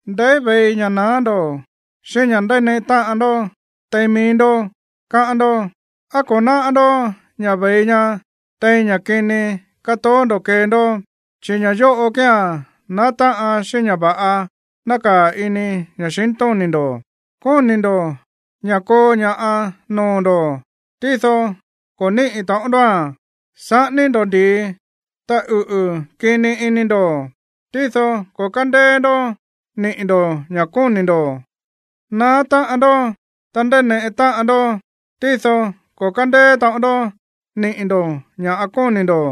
¿Ndeí ve̱i ña̱ naá ndo̱, xíꞌín ña̱ ndáneꞌe táꞌan ndó tein mií ndó, káꞌán ndó? ¿Á ko̱ náꞌá ndó ña̱ ve̱i ña tein ña̱ kini kátoó ndo̱ kée ndó, chi̱ ña̱ yóꞌo kía̱n naá táꞌan xíꞌín ña̱ va̱ꞌa nákaa̱ ini ña̱xintóni̱ ndo̱? Kóni̱ ndo̱ ña̱ koo ña̱ꞌa noo̱ ndo̱, tído ko̱ níꞌi̱ taꞌon ndóa̱n. Saꞌání ndó ndi̱i, ta uꞌu̱ kini ini ndo̱, tído ko̱ kándéé ndó niꞌi̱ ndo̱ ña̱ kóni̱ ndo̱. Naá táꞌan ndó, ta ndáneꞌe táꞌan ndó, tído ko̱ kándéé taꞌon ndó niꞌi̱ ndo̱ ña̱ kóni̱ ndo̱,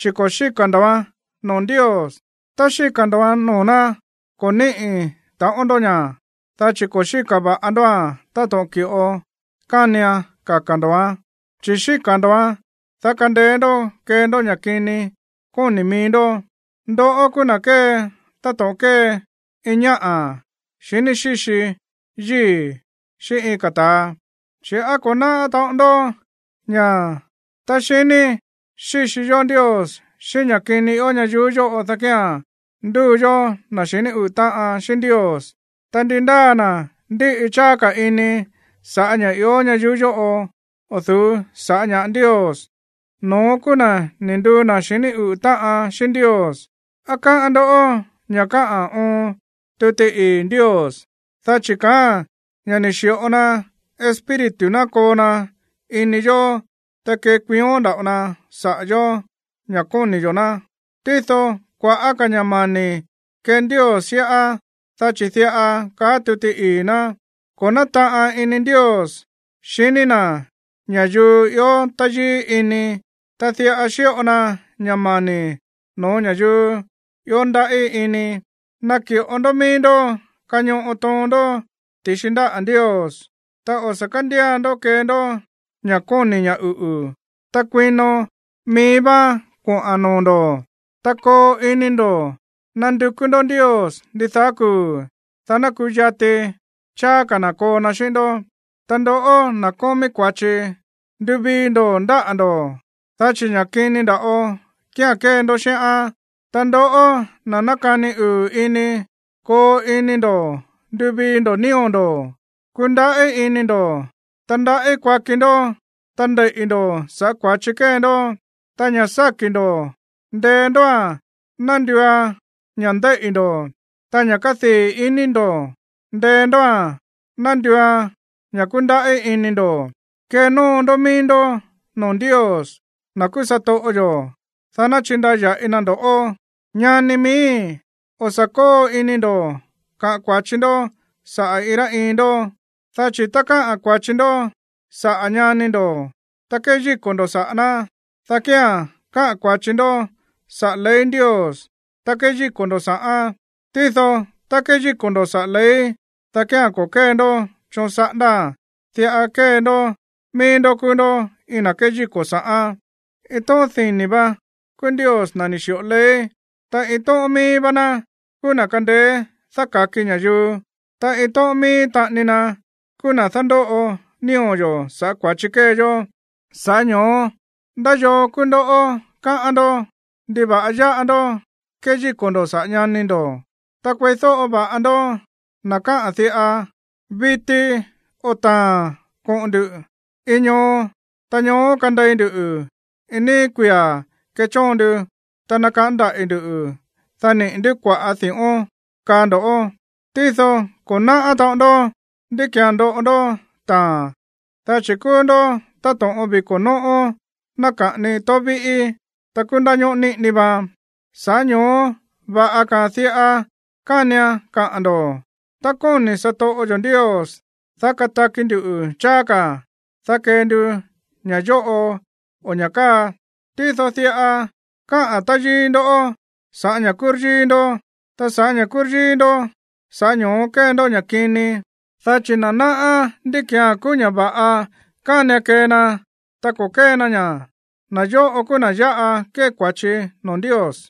chi̱ ko̱ xíka̱ ndo̱án noo̱ Ndios. Tá xíka̱ ndo̱án noo̱ ná, ko̱ níꞌi̱ taꞌon ndó ña̱, dá chi̱ ko̱ xíka̱ va̱ꞌa ndóa̱n táto̱ꞌon ki̱ꞌo kánian kaka̱ ndo̱án. Chi̱ xíka̱ ndo̱án, dá kandeé ndó kee ndó ña̱ kini kóni̱ mií ndó. ¡Ndoꞌó kúú na̱ kée táto̱ꞌon kée iin ñáꞌa̱ xiní xíxi yíi̱ xíꞌín iin ka̱ ta̱a! Chi̱, ¿á ko̱ náꞌá taꞌon ndó ña̱ tá xiní xíxi yó Ndios xíꞌín ña̱ kini ió ñayuú yóꞌo, dá kía̱n nduu yó na̱ xiní uꞌu̱ táꞌan xíꞌín Ndios? Ta ndi ndáa na̱ ndíꞌi cháá ka̱ ini sa̱ꞌá ña̱ ió ñayuú yóꞌo o̱ du̱ú sa̱ꞌá ña̱ꞌa Ndios, no̱ón kúú na̱ ni̱ nduu na̱ xiní uꞌu̱ táꞌan xíꞌín Ndios. ¿Á káꞌán ndó ña̱ káꞌa̱n oon tuti ii̱ Ndios? Dá chi̱ kaáa̱n ña̱ ni̱ xi̱ꞌo na Espíritu na̱ koo na ini yóó, ta kékuión nda̱ꞌo na saꞌa̱ yóó ña̱ koni̱ yo̱ ná. Tído kua̱ꞌá ka̱ ña̱ mani̱ kée Ndios xíꞌá, dá chi̱ diꞌa káꞌa̱n tuti ii̱ ná: “Ko̱ nátaꞌan ini Ndios xiní na̱ ña̱yuu ió táyíí ini, ta diꞌa xíꞌo na ña̱ mani̱ no̱ó ña̱yuu ió ndaꞌí ini.” Naki̱ꞌo ndó mií ndó kañoꞌo toon ndó ti̱xi ndáꞌa̱ Ndios. Ta o̱ sa̱ kándía ndó kee ndó ña̱ kóni̱ ña̱ uꞌu̱, ta kuino mií váán koꞌa̱n noo̱ ndo̱. Ta koo ini ndo̱ nandukú ndó Ndios ndidaá kuu̱, dá ná kuyati cháá ka̱ na̱ koo na xíꞌín ndó. Ta ndoꞌó, na̱ kómí kua̱chi, nduvii ndo̱ ndáꞌa̱ ndó, dá chi̱ ña̱ kini nda̱ꞌo kía̱n kée ndó xíꞌán. Ta ndoꞌó, na̱ nákani uu̱ ini, koo ini ndo̱ nduvii ndo̱ nío̱ ndo̱. Kundaꞌí ini ndo̱, ta ndaꞌí kuaki ndó, ta ndeiꞌi̱ ndo̱ sa̱ꞌá kua̱chi kée ndó. Ta ña̱ sáki̱ ndo̱, ndee ndóa̱n ná nduuan ña̱ ndeiꞌi̱ ndo̱. Ta ña̱ kádii̱ ini ndo̱, ndee ndóa̱n ná nduuan ña̱ kundaꞌí ini ndo̱. Kenóo ndó mií ndó noo̱ Ndios, na̱ kúú satoꞌo yo̱, dá ná chindaya̱ꞌi na ndo̱ꞌó. Ñani miíi̱, o̱ sa̱ kóo ini ndo̱ kaꞌa̱n kua̱chi ndó saꞌa̱ iin rá iin ndó. Dá chi̱ tá káꞌa̱n kua̱chi ndó saꞌa̱ ñani ndo̱, ta kéyíko̱ ndo̱ saꞌa̱ ná, dá kía̱n káꞌa̱n kua̱chi ndó saꞌa̱ ley Ndios, ta kéyíko̱ ndo̱ sa̱ꞌán. Tído tá kéyíko̱ ndo̱ saꞌa̱ ley, dá kía̱n ko̱ kée ndó choon saꞌándáa̱n, diꞌa kée ndó mií ndó kúú ndó iin na̱ kéyíko̱ sa̱ꞌán. Iin tóꞌón dini̱ vá kúú Ndios, na̱ ni̱ xi̱ꞌo ley. Ta iin tóꞌón mií vá ná kúú na̱ kándéé dáka̱ki ña̱yuu, ta iin tóꞌón mií taꞌani na kúú na̱ dándóꞌo nío̱ yo̱ sa̱ꞌá kua̱chi kée yó. Sa̱ꞌá ño̱ó, ¿ndá yoo kúú ndoꞌó, káꞌán ndó? ¿Ndiva̱ꞌa yáꞌa ndó kéyíko̱ ndo̱ saꞌa̱ ñani ndo̱? Ta kueídóꞌo va̱ꞌa ndoꞌó, na̱ káꞌa̱n diꞌa: “Viti o taa̱n koꞌo̱n ndu̱ iin ñoo, ta ñoó kandei ndu iin níí kuia̱ kechóon ndu, ta nakaꞌán ndaꞌi̱ ndu̱, dá niꞌi̱ ndú kua̱ꞌá di̱ꞌón”, kaá ndo̱ꞌó. Tído ko̱ náꞌá taꞌon ndó ndí ki̱án ndoꞌo ndó taa̱n, dá chi̱ kúú ndó táto̱ꞌon viko̱ nóꞌó náka̱ꞌani tóó víꞌí, ta kúú ndáñóꞌó niꞌini vaan. Sa̱ꞌá ño̱ó va̱ꞌa ka̱a̱n diꞌa kánian kaꞌa̱n ndo̱: “Tá kóni̱ satoꞌo yo̱ Ndios, dá kataki ndu̱ cháá ka̱, dá kee ndu ña̱ yóꞌo o ña̱ káa.” Tído diꞌa káꞌa̱n táyíí ndó sa̱ꞌá ña̱ kúryíí ndó, ta sa̱ꞌá ña̱ kúryíí ndó, sa̱ꞌá ño̱ó kée ndó ña̱ kini. Dá chi̱ na̱ náꞌá ndí ki̱án kúú ña̱ va̱ꞌa kánian kee na, ta ko̱ kée na ña̱, na̱ yóꞌo kúú na̱ yáꞌa kée kua̱chi noo̱ Ndios.